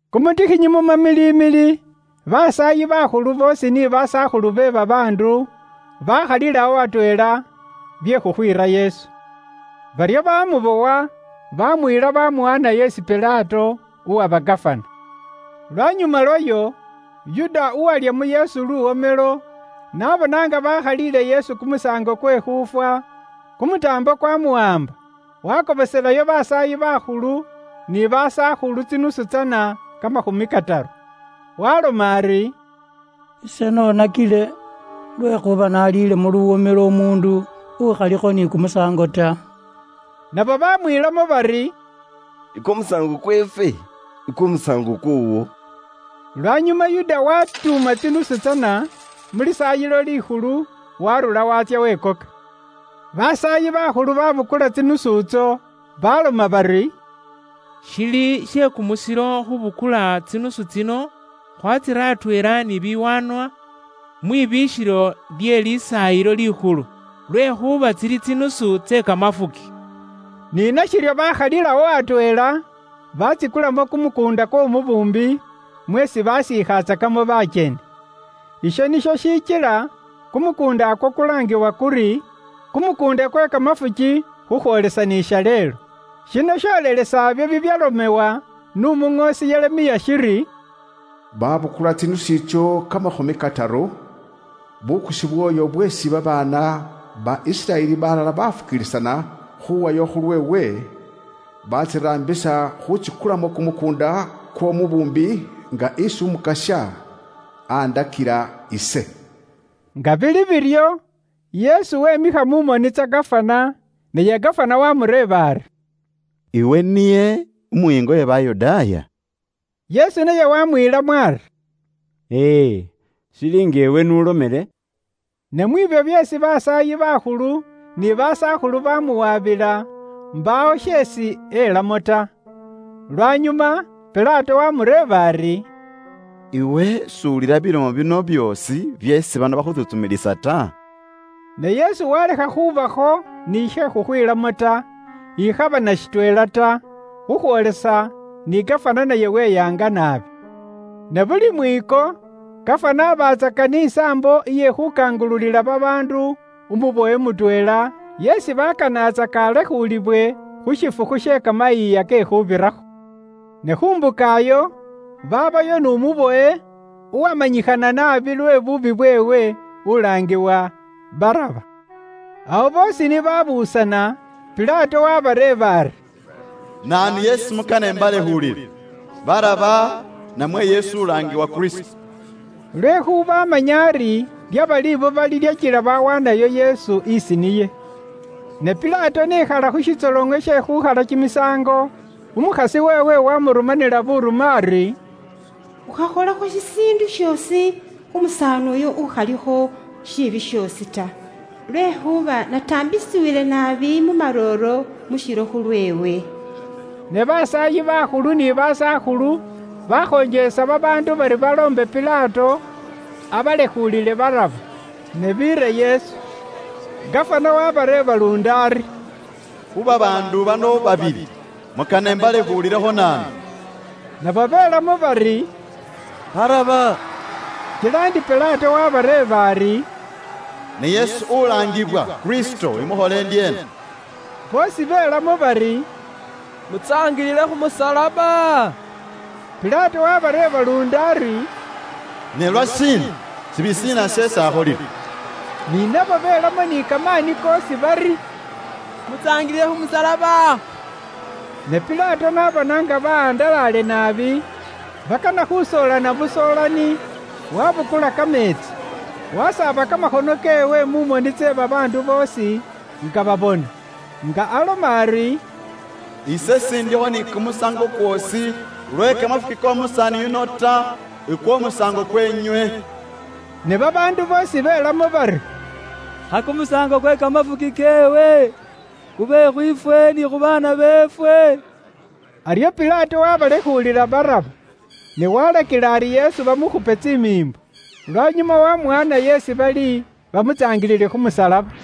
Kumutikhinyi mu mamilimili, basaayi bakhulu boosi ni basakhulu be babaandu, bakhalilawo atweela bye khukhwiira Yesu. Baryo bamubowa, baamuyila, bamuwaanayo isi Pilato, uwaba gafana. Lwanyuma lwayo, Yuda uwalya mu Yesu luwomelo, n'abona nga bakhaliile Yesu kumusaango kwe khuufwa, kumutaambo kwaamuwaamba, wakobosela basaayi bakhulu ni basakhulu tsinusu tsana kamakhumi kataru. Waaloma ari, “Ise noonakile, lwekhuuba naaliilemo luwomelo umuundu ukhalikho ni kumusaango ta.” Nabo baamwiilamo bari, “Ikwo musaango kweefwe? Ikwo musaango kwoowo.” Lwanyuma Yuda waatuuma tsinusu tsana mu Lisaayilo Likhulu, waarura waatsya wekoka. Basaayi bakhulu babukula tsinusu itso, baloma bari, “Shili she kumusilo khubukula tsinusu tsino khwatsira atweela ni biwaanwa mwibiikhilo lye Lisaayilo Likhulu, lwekhuuba tsili tsinusu tse kamafuki.” Ni nashiryo bakhalilawo atweela, batsikulamo kumukuunda kw'omubuumbi mweesi baasiikhatsakamo bakyeni. Isho nisho shishikila kumukuundakwo kwalaangiwa kuri, kumukuunda kwe kamafuki, khukhwoolesa ni shaleelo. Shino sholelesa ibyo bibyalomewa n'Umuŋoosi Yeremiya shiri, “Babukula tsinusu itso kamakhumi kataru, bukusi bw'oyo bweesi babaana ba Isiraeli balala bafukiilisana khuwayo khulweewe, batsiraambisa khutsikulamo kumukuunda kw'omubuumbi nga esi Umukasya andakila ise.” Nga bili biryo, Yesu wemikha mu moni tsa gafana, naye gafana waamureeba ari, “Iwe niye umuyiinga we Bayudaaya?” Yesu naye waamwiilamo ari, “Ee, shili nga iwe n'ulomele.” Ne mwiibyo byeesi basaayi bakhulu ni basakhulu bamuwabila, mbaawo sheesi elamo ta. Lwanyuma Pilato waamureeba ari, “Iwe s'uwulila bilomo bino byoosi byeesi bano bakhutsuntsumilisa ta?” Ne Yesu walekha khubakho ni she khukhwiilamo ta, ikhaba na shitweela ta, khukhwoolesa ni gafana naye weyaanga naabi. Ne buli mwiiko gafana aabatsaka ni saambo iye khuukangululila babaandu umubowe mutweela isi baakanatsaka alekhuulibwe khu shifukhu she Kamayiiya ke Khuubirakho. Ne khu mbuka iyo, baabayo n'umubowe abe uwamanyikhana naabi lwe buubi bweewe, uwalaangiwa Baraba. Awo boosi ni babuusana, Pilato wabareeba ari, “Naanu yeesi mukana imbalekhuulile; Baraba namwe Yesu ulaangibwa Kristo?” Lwekhuuba amanya ari lyaba libuba lilyakila bawaanayo Yesu isi niye. Ne Pilato ni ekhala khu shitsoloŋo she khuukhalilakho kimisaango, umukhasi weewe waamurumanila buurume ari, “Ukhakholakho shishiindu shoosi khu musaani uyo ukhalikho shiibi shoosi ta, lwekhuuba nataambisiwile naabi mu marooro mu shilo khulweewe.” Ne basaayi bakhulu ni basakhulu bakhonjelesa babaandu bari baloombe Pilato abalekhuulile Baraba, ne biire Yesu. Gafana waabareeba luundi ari, “Khu babaandu bano babili, mukana imbalekhuulile naanu?” Nabo belamo bari, “Baraba!” Kila ndi Pilato waabareeba ari, “Ne Yesu ulaangiwa Kristo, imukhole ndyeena?” Boosi belamo bari, “Mutsaangilile khu musalaba!” Pilato waabareeba luundi ari, “Ne lwashiina? Shiibi shiina sheesi akholile?” Ne nabo belamo ni kamaani koosi bari, “Mutsaangilile khu musalaba!” Ne Pilato n'abona nga bahandalale naabi, bakana khusoolana busoolani, wabukula kameetsi, wasaaba kamakhono keewe mu moni tse babaandu boosi nga babona, nga aloma ari, “Ise sindikho ni kumusaango kwoosi lwe kamafuki k'omusaani yuno ta, ukwo musaango kweenywe!” Ne babaandu boosi belamo bari, “Kha kumusaango kwe kamafuki keewe kube khwiifwe ni khu baana beefwe!” Aryo Pilato waabalekhuulila Baraba, ne waalakila ari Yesu bamukhupe tsimiimbo, lwanyuma waamuwaanayo isi bali bamutsaangilile khu musalaba.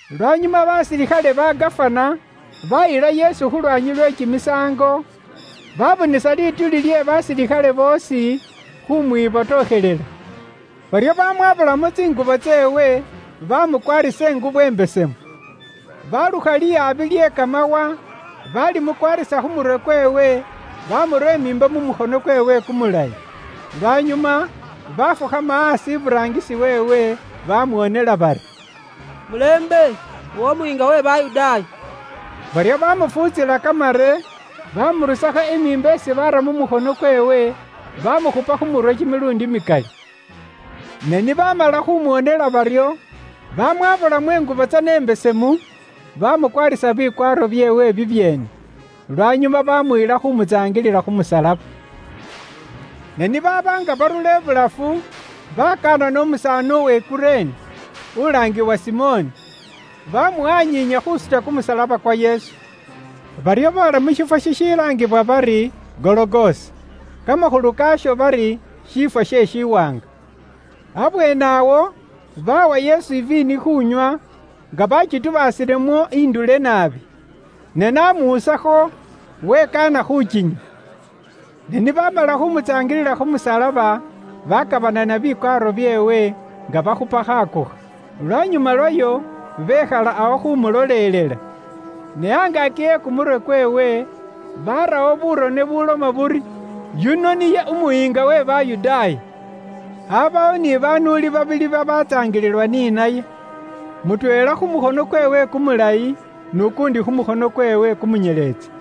Lwanyuma basilikhale ba Gafana baayila Yesu khu lwaanyi lwe kimisaango, baabuusaasa lituuli lye basilikhale boosi khumwibotokhelela. Baryo baamwaabulamo tsingubo tseewe, baamukwaarisa ingubo imbesemu. Baalukha lihabi lye kamawa, baalimukwaarisa khu murwe kweewe, baamura imiimbo mu mukhono kweewe kumulayi. Lwanyuma baafukhama aasi iburaangisi weewe, bamwoonela bari, “Mulembe iwe umuyiinga we Bayudaaya!” Baryo baamufuutsila kamare, baamurusakho imiimbo isi baara mu mukhono kweewe, baamukhupa khu murwe kimiluundi mikali. Ne ni baamala khumwoonela baryo, baamwaabulamo ingubo tsana imbesemu, baamukwaarisa bikwaaro byeewe bibyeene. Lwanyuma baamuyila khuumutsaangilila khu musalaba. Ne ni baaba nga barura ibulafu, baakanana umusaani uwe Kurene, uwalaangiwa Simoni; baamuwanyiinya khuusuta kumusalaba kwa Yesu. Baryo boola mu shiifwo shishilaangibwa bari Gologosa (kamakhulu kaasho bari shiifwo she shiwaanga). Abweene awo baawa Yesu iviini khuunywa, nga bakitubaasilemo indule naabi, na namuusakho, wekaana khukinywa. Ne ni baamala khumutsaangilila khu musalaba, bakabanana bikwaaro byeewe, nga bakhupa khakokha Lwanyuma lwayo, bekhala awo khumulolelela. Ne angaaki e kumurwe kweewe barawo burone bubuloma buri, OYUNO NIYE UMUYIINGA WE BAYUDAAYA. Aabawo ni banuuli babili babaatsaangililwa ni naye, mutweela khu mukhono kweewe kumulayi, n'ukuundi khu mukhono kweewe kumunyeletsi.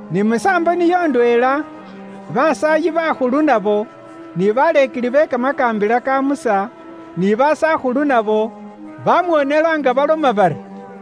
Ni musaambo niyo ndweela basaayi bakhulu nabo, ni baleekeli be kamakaambila ka Musa, ni basakhulu nabo, bamwoonela nga baloma bari,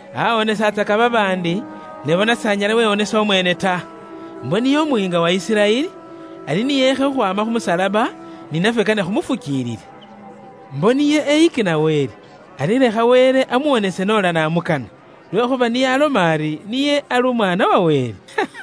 “Aawonesatsaka babaandi, ne bona s'anyala wewonesa umweene ta! Mbo niye umuyiinga wa Isiraeli, ari ni eekhe khukhwaama khu musalaba, ni nafwe kane khumufukiilile. Mbo niye eyikina Wele, ari lekha Wele amuwonese noola namukana, lwekhuuba niye aloma ari, niye ali Umwaana wa Wele.”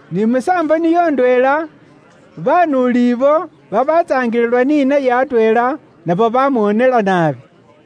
Ni musaambo niyo ndweela, banuuli ibo babatsaangililwa ni naye atweela nabo bamwoonela naabi.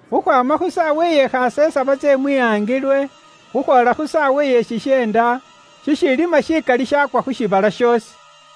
Khukhwaama khu saawa iye khasesaba tse mwihangilwe, khukhwoola khu saawa iye shisheenda, shishiilima shikali shaakwa khu shiibala shoosi.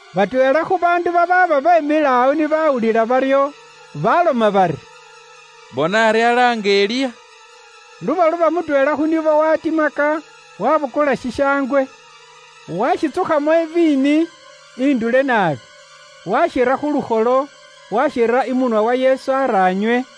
Batweela khu baandu babaaba beemile awo ni bawulila baryo, baaloma bari, “Bona ari alaanga Eliya.” Lubaluba mutweela khu nibo waatimaka, waabukula shishaangwe, waashitsukhamo iviini indule naabi, waashira khu lukholo, waashira imunwa wa Yesu ari anywe.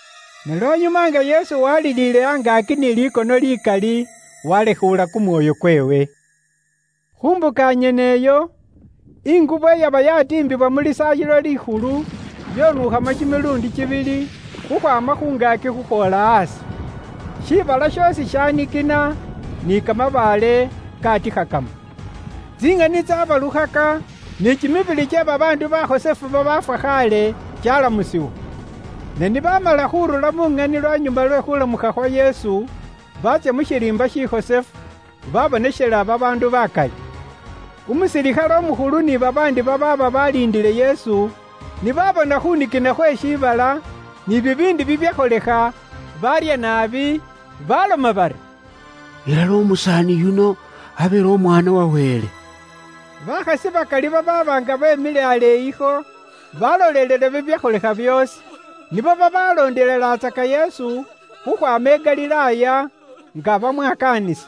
Ne lwanyuma nga Yesu waaliliile angaaki ni likono likali, waalekhuula kumwoyo kweewe. Khu mbuka nyene iyo, ingubo iyaba yaatiimbibwa mu Lisaayilo Likhulu, yonuukhamo kimiluundi kibili, khukhwaama khu ngaaki khukhwoola aasi. Shibala shoosi shaanikina, ni kamabaale kaatikhakamo. Tsiŋani tsaabalukhaka, ni kimibili kye babaandu bakhosefu babaafwa khaale kyaalamusibwa. Ne ni baamala khuurura mu ŋani lwanyuma lwe khuulamukha khwa Yesu khukhwaama mu bafu, baatsya mu shiriimba shikhosefu, babonekhela babaandu bakali. Umusilikhale umukhulu ni babaandi babaaba baliindile Yesu, ni baabona khunikina khwe shiibala, ni bibiindi bibyakholekha, baarya naabi, baloma bari, “Ilala umusaani yuno abeele Umwaana wa Wele.” Bakhasi bakali babaaba nga beemile aleeyikho, balolelela bibyakholekha byoosi. Nibo babaloondelelatsaka Yesu khukhwaama i Galilaaya, nga bamwakaanisa.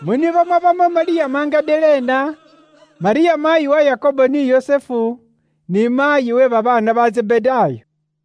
Mu nibo mwabamo Malyamu Magadalena, Malyamu Maayi wa Yakobo ni Yusufu, ni maayi we babaana ba Zebedaayo.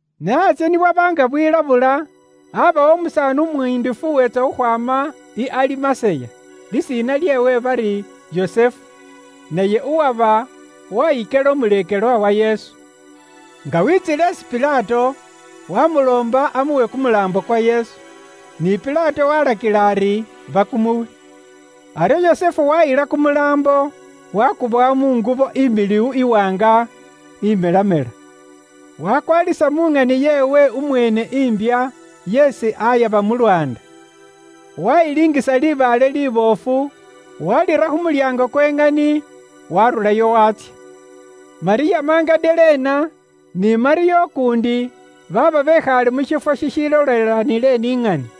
Ne antsye ni bwaba nga bwilabula, abawo umusaani umuyindifu uweetsa khukhwaama i Alimaseya, lisiina lyeewe bari Yusufu, naye uwaba waayikela umuleekelwa wa Yesu. Nga waatsiile isi Pilato, waamuloomba amuwe kumulaambo kwa Yesu. Ni Pilato waalakila ari bakumuwe. Aryo Yusufu waayila kumulaambo, waakubowa mu ngubo, imiliwu iwaanga imelamela. Waakwalisa mu ŋani yeewe umweene imbya yeesi aayaba mu lwaanda. Waayilingisa libaale liboofu, waalira khu mulyaango kwe ŋani, waarurawo waatsya. Malyamu Magadalena ni Malyamu ukuundi baaba bekhaale mu shiifwo shishilolelaniile ni ŋani.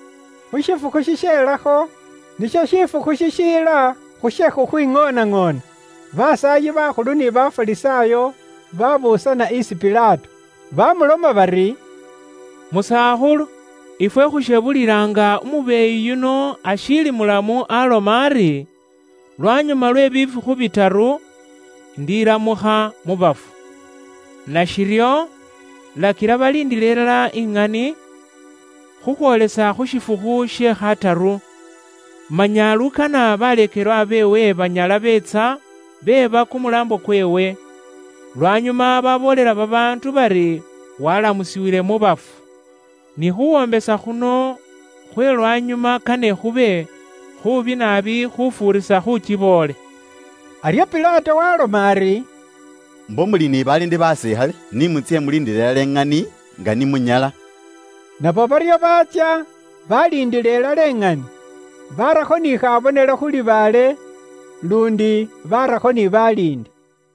Khu shifukhu shisheelakho, nisho shifukhu shishiila khu she khukhwiŋoonaŋoona, basaayi bakhulu ni Bafarisaayo baabuusana isi Pilato, baamuloma bari, “Musakhulu, ifwe khushebulila nga umubeeyi yuno ashiili mulamu aaloma ari, ‘Lwanyuma lwe bifukhu bitaru, indilamukha mu bafu.’ Nashiryo, lakila baliindiile ilala ŋani, khukhwoolesa khu shifukhu she khataru. Manya lukana baleekelwa beewe banyala beetsa beeba kumulaambo kweewe, lwanyuma baboolela babaandu bari walamusiwile mu bafu. Ni khuwoombesa khuno khwe lwanyuma kane khube khuubi naabi khufuurisa khuukiboole.” Aryo Pilato waaloma ari, “Mbo muli ni baliindi basilikhale, ni mutsye muliindile ilala iŋani nga ni munyala.” Nabo baryo baatsya, baliindila ilala iŋani, barakho ni khabonelo khu libaale, luundi barakho ni baliindi.